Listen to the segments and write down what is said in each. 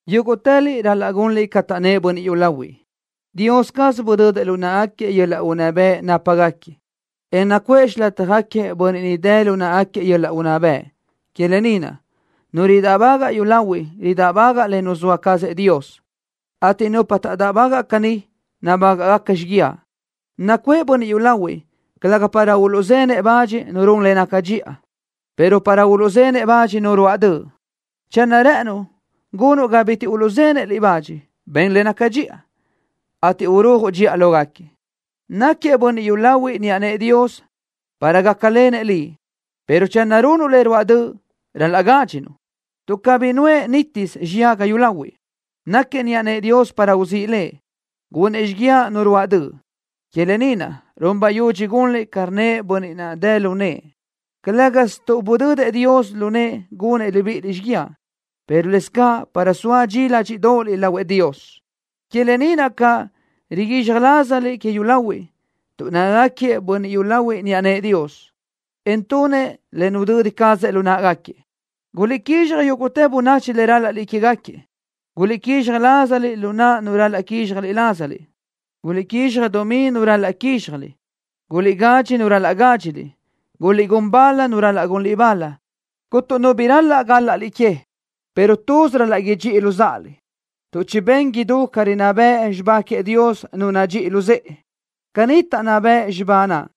Yúguʼtëliʼ ral-laʼ gunliʼ ca taʼnnë́ʼ bönniʼ yúlahuiʼ. Dios caz budödëʼ lu náʼagaquiëʼ yöl-laʼ unná bëʼ nápagaquiëʼ, en nucuʼë xilátjagaquiëʼ bönniʼ ni dë lu náʼagaquiëʼ yöl-laʼ unná bëʼ. Que lë ni naʼ, nu ridáʼbagaʼ yúlahuiʼ ridáʼbagaʼ le nuzóa cazëʼ Dios, ateʼ nupa taʼdáʼbagaʼ caní, nabágaʼgaca xiguiaʼ. Nacuʼë bönniʼ yúlahuiʼ, calëga para uluʼzenëʼ bach nu run le naca dxiʼa, pero para uluʼzenëʼ bach nu ruáʼ döʼ. Channö rë́ʼënuʼ gunuʼ ga bitiʼ uluʼzenëʼ liʼ bach, ben le naca dxiʼa, ateʼ urujuʼ dxiʼa lógaquiëʼ. Náquiëʼ bönniʼ yúlahuiʼ niʼa nëʼë Dios para gácalenëʼ liʼ, pero channö runuʼ le ruáʼ döʼ, ral-laʼ gádxinuʼ, tuʼ cabí nuʼë nítisö xiyaga yúlahuiʼ. Náquiëʼ niʼa nëʼë Dios para uzíʼ lëbëʼ, gunëʼ xíguiaʼ nu ruáʼ döʼ. Que lë ni naʼ run bayudxi gunliʼ ca rnnëʼ bönniʼ naʼ dë lu nëʼë, calë́gasö tuʼ budödëʼ Dios lu nëʼë gunëʼ libíʼiliʼ xíguiaʼ, pero lëscaʼ para soa dxi ládxiʼdoʼoliʼ lahuëʼ Dios. Que lë ni naʼ caʼ riguizxaj lázaliʼ que yúlahuiʼ, tuʼ nácagaquiëʼ bönniʼ yúlahuiʼ niʼa nëʼë Dios, en tunëʼ le nudödi cazëʼ lu náʼagaquiëʼ. Guliʼguízxaj yúguʼtë bönachi le rál-laʼliʼ quégaquiëʼ. Guliʼguízxaj lázaliʼ lu naʼ nu ral-laʼ quizxaj lázaliʼ. Guliʼguízxaj dumí nu ral-laʼ quízxjaliʼ. Guliʼgadxi nu ral-laʼ gádxiliʼ, en guliʼgún bal nu ral-laʼ gunliʼ bal. Cuntu nu bi ral-laʼ gál-laʼliʼ que, pero tuz ral-laʼ idxíʼiliʼ luzáʼaliʼ, tuʼ chibén idú ca rinná bëʼ xibá queëʼ Dios nu nadxíʼi luzë́ʼe. Caní taʼnná bëʼ xibá naʼ: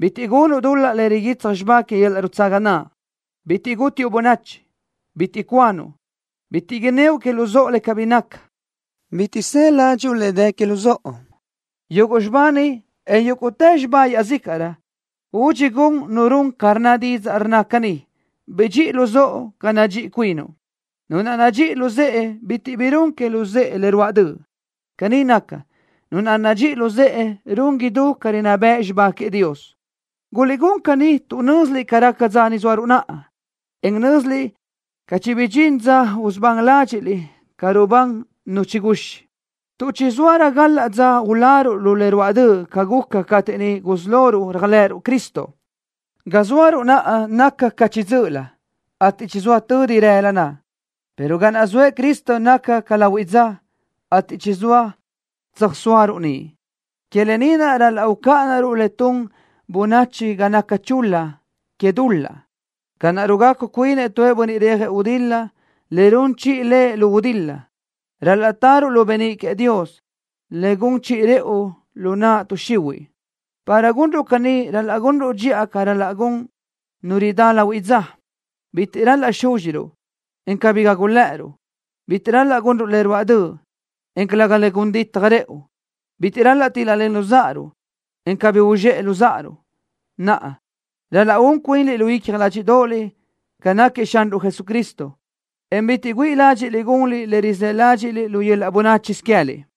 Bitiʼ gunuʼ dul-laʼ le riguitsaj xibá que yöl-laʼ nutsaga naʼ. Bitiʼ gútiuʼ bönachi. Bitiʼ cuanuʼ. Bitiʼ inníoʼ que luzóʼo le cabí nácatë. Bitiʼ së ládxuʼu le dë que luzóʼo. Yuguʼ xibá ni, en yúguʼtë xibá iaʼzícaʼrö, údxi gun nu run ca rnna didzaʼ rnna caní: Bidxíʼi luzóʼo ca nadxíʼi cuinuʼ. Nu naʼ nadxíʼi luzë́ʼe bitiʼ bi run que luzë́ʼe le ruáʼ döʼ. Caní naca, nu naʼ nadxíʼi luzë́ʼe run idú ca rinná bëʼ xibá queëʼ Dios. Guliʼgún caní tuʼ nö́ziliʼ ca raca dza ni zóaruʼ naʼa, en nö́ziliʼ caʼ chibidxín dza usubán ládxiʼliʼ ca rubán nu chiguxi, tuʼ chizóarö gal-laʼ dza uláruʼ lu le ruáʼ döʼ ca guca cateʼ niʼ gusí loruʼ réajlëʼëruʼ Cristo. Ga zóaruʼ naʼa naca ca chiʼi dzö́ʼölö, ateʼ chizóa tödi rëla naʼ, pero ga naʼ zoëʼ Cristo naca ca lahuiʼ dza, ateʼ chizóa tsöjsóaruʼ niʼ. Que lë ni naʼ ral-laʼ ucáʼanaruʼ le tun bönachi ga naca chul-la que dul-laʼ. Ca naʼ rugacu cuinëʼ tu bönniʼ rejëʼ gudil-la le run chiʼi lëʼ lu gudil-la, ral-laʼ taruʼ lu beníʼ queëʼ Dios, le gun chiʼi rëʼu lu naʼ tuʼ xihuiʼ. Para gunruʼ caní ral-laʼ gunruʼ dxiʼa ca ral-laʼ gun nu ridá lahuiʼ dza. Bitiʼ ral-laʼ súdxiruʼ, en cabí gágulëʼëruʼ. Bitiʼ ral-laʼ gunruʼ le ruáʼ döʼ, en calëga le gun ditaj rëʼu. Bitiʼ ral-laʼ tíl-lalenruʼ luzáʼaruʼ, en cabí uzxéʼeruʼ luzáʼaruʼ. Naʼa, ral-laʼ un cuinliʼ lu icja ládxiʼdoʼoliʼ ca náquiëʼ Xanruʼ Jesucristo, en bitiʼ güíʼi ládxiʼliʼ gunliʼ le rizë́ ládxiʼliʼ lu yöl-laʼ bönáchisö queë́liʼ.